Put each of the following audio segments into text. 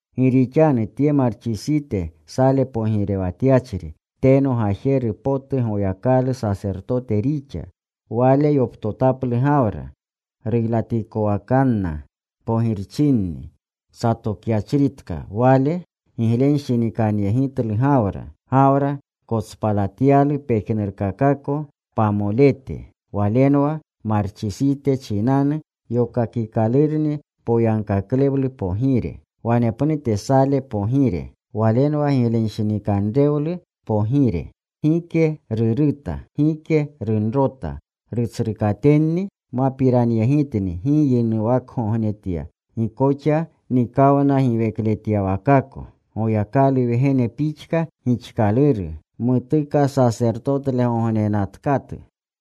Gi rixanu tye Marchisite, Sale pogirewatyachri, teno gajeru potu Goyakalu sasertotete rixa, wale yoptotaplu Gawrani, ruylatikowakanna pogirchinni satokyachritka. Wale giglenshinikanyegitlu Gawra. Gawra kotspalatyalu pejnurkakako pamolete. Walenwa Marchisite muchinanu yokakikalurni poyagkaklewlu pogire. Wanepnute Sale pogire. Walenwa giglewanshinikanrewlu pogire. Gike ruruta. Gike runrota. Rutsrukatenni mapiranyegitni. Gi yinuwakgognetya. Gi koxa nikawnagiwekletyawakako. Goyakalu Wgene pixka gixkaluru. Mutuka sasertotetlegognenatkatu.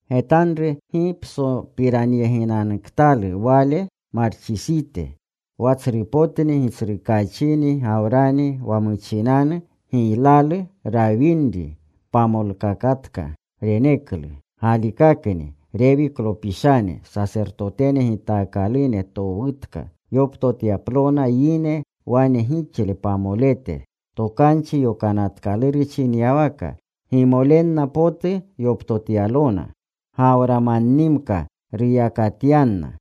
Getanru. ¡Gi psopiranyeginanuktalu wale Marchisite! Wa tsrupotni gitsrukaachiini Gawrani wa muchinanu giylalu rawinri pamoletkaka reneklu. Galikakni Rewiklopishane, sasertote gitaakalune towutka yoptotyaplona yine wane gixle pamolete, Tokanchi Yokanatkaluru chinyawaka. Gimolenna potu yoptotyalona. Gawramannimka ruyakatyanna.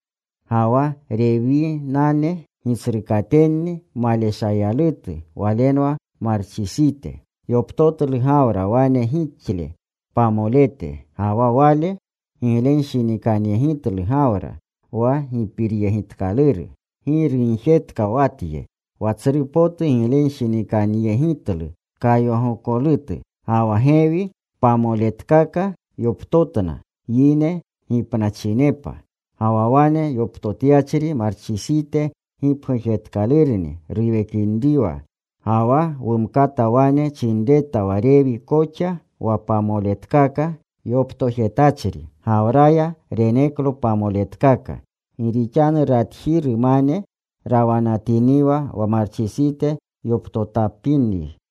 Ga wa Rewinane gitsrukatenni maleshayalutu, walenwa Marchisite, yoptotlu Gawra wane gixle pamolete, ga wa wale giglenshinikanyegitlu Gawra, wa gipiryegitkaluru. Gi rugjetka wa tye: Wa tsru potu giglenshinikanyegitlu kayagokolutu. Ga wa gewi pamoletkaka yoptotna yine gipnachinepa. Ga wa wane yoptotyachri Marchisite gipgujtatkalurni ruwekinriwa. Ga wa wumkata wane chinreta wa Rewi koxa wa pamoletkaka yoptojetachri, Gawraya reneklo pamoletkaka. Gi rixanu ratjirumane rawanatiniwa wa Marchisite yoptotapinri.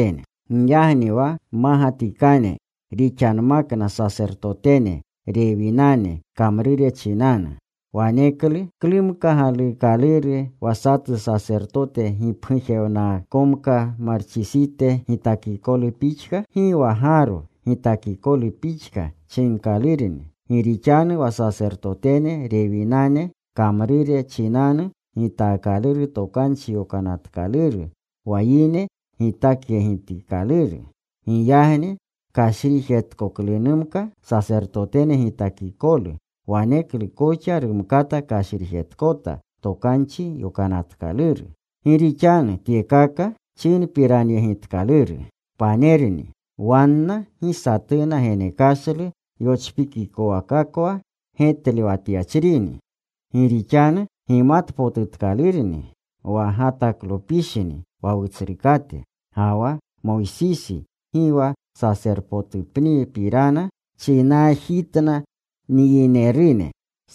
Giyagni wa mmagatikane rixanmakna sasertotene Rewinane kamrure chinanu, waneklu ¿klumka galuukaluru wa satu Sasertote gipgujewnakaakomka Marchisite gitakikolu pixka? Gi wa Gaaro gitakikolu pixka chinkalurni. Gi rixanu wa sasertotene Rewinane kamrure chinanu gitaakaluru Tokanchi Yokanatkaluru, wa yine gitakyegitikaluru. Giyagni kashrijetkoklunmaka sasertotene gitakikolu, waneklu koxa rumkata kashrijetkota Tokanchi Yokanatkaluru. Gi rixanu tyekaka chinpiranyegitkaluru, panerni. Wanna gi satuna genekashlu yochpikikowakakwa getlewatyachrini. Gi rixanu gimatpotutkalurni wa Gotaklopishni wa Wutsrukate. Ga wa Moysisi gi wa sasertotenepnipirana chinaajitna nyinerune.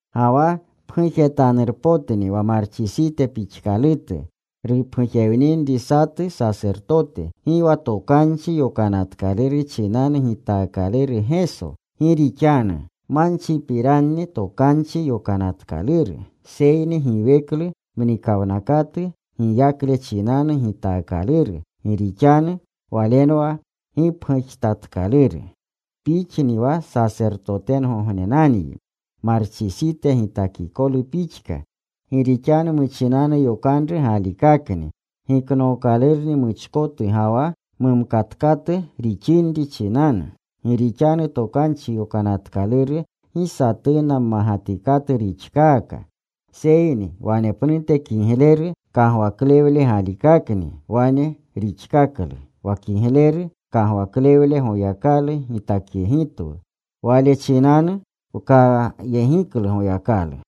Ga wa pgujetanurpotni wa Marchisite pixkalutu rupgujewninri satu Sasertote. Gi wa Tokanchi Yokanatkaluru chinanu gitaakaluru Geso, gi rixanu manchipiranni Tokanchi Yokanatkaluru. Seyni giweklu mnikawnakatu giyakle chinanu gitaakaluru. Gi rixanu Walenwa gipgujtatkaluru: Pixni wa Sasertotgognenanyi, Marchisite gitakikolu pixka. Gi rixanu muchinanu yokanru galikakni giknookalurni muchkotu ga wa mumkatkatu rixinri chinanu. Gi rixanu Tokanchi Yokanatkaluru gi satuna mmagatikatu rixkaka. Seyni wanepnute kigleru kagwaklewle galikakni wane rixkaklu, wa kigleru kagwaklewle Goyaklalu gitakyegitwu. Wale chinanu wkayegiklu Goyakalu.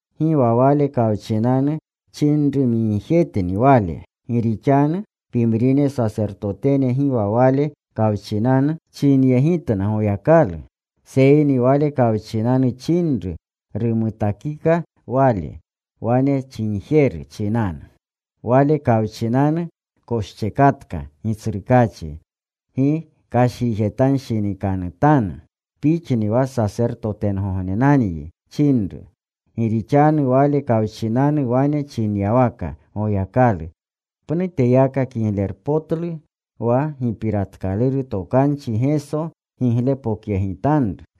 Gi wa Wale kawchinanu chinrumigjetni Wale. Gi rixanu pimrine sasertotene gi wa Wale kawchinanu chinyegitna Goyakalu. Seyni Wale kawchinanu chinru rumutakika Wale, wane chinjeru chinanu: Wale kawchinanu koschekatka Gitsrukaachi. Gi kashrijetanshinikanutanu. “Pixni wa Sasertotgognenanyi,” chinru. Gi rixanu Waleko kawchinanu wane chinyawaka Goyakalu, pnuteyaka kiglepotlu wa gipiratkaluru tokanchi Geso giglepokyegitanru.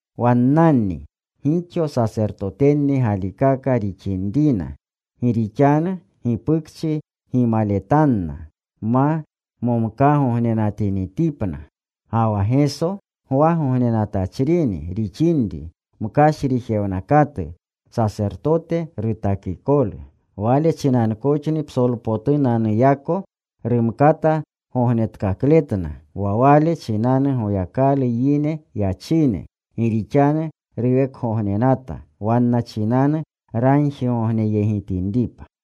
Wannani gixo sasertotenni galikaka rixnina, gi rixanu gipukchi gimaletanna ma momkaagognenatinitipna. Ga wa Geso gwagognenatachrini rixinri, mkashrijewnakatu sasertote rutakikolu. Wale chinankoxni psolpotunanuyako rumkata gognetkakletna wa Wale chinanu Goyakalu yegi yachine. Gi rixanu ruwekgognenata wanna chinanu ragjigogneyegitinripa.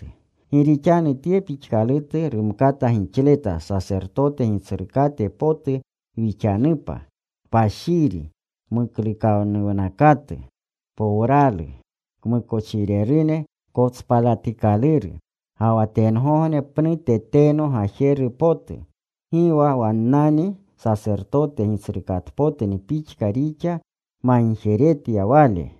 Gi rixanu tye pixkalutu rumkata gixleta sasertote gitsrukate potu wixanupa: kpashiri, muklukanuwnakatu, powralu, kmukochirerune kotspalatikaluru, ga wa tengogne pnute teno gajeru potu. Gi wa wannani sasertote gitsrukatenpotni pixka rixa magjeretya Wale,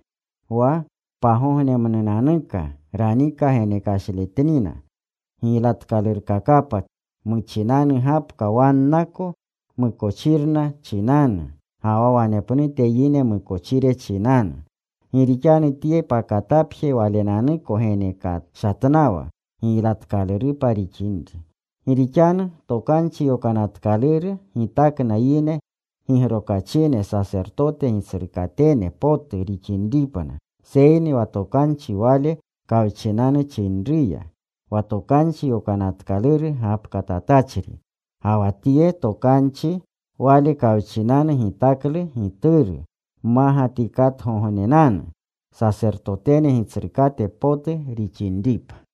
wa pagognemnunanuka ranika genekashletnina giylatkalurkakapa muchinanu gapka wannako mukochirna chinanu, ga wa wanepnute yine mukochire chinanu. Gi rixanu Tye pakatapje Walenanuko genekashatnawa giylatkalurupa rixinri. Gi rixanu Tokanchi Yokanatkaluru gitakna yine gigrokachine sasertote gitsrukatene potu rixinripna. Seyni wa tokanchi Wale kawchinanu chinruya, wa Tokanchi Yokanatkaluru gapkatatachri. Ga wa tye tokanchi Wale kawchinanu gitaklu Gituru mmagatikatgognenanu, sasertotene Gitsrukate potu rixinripa.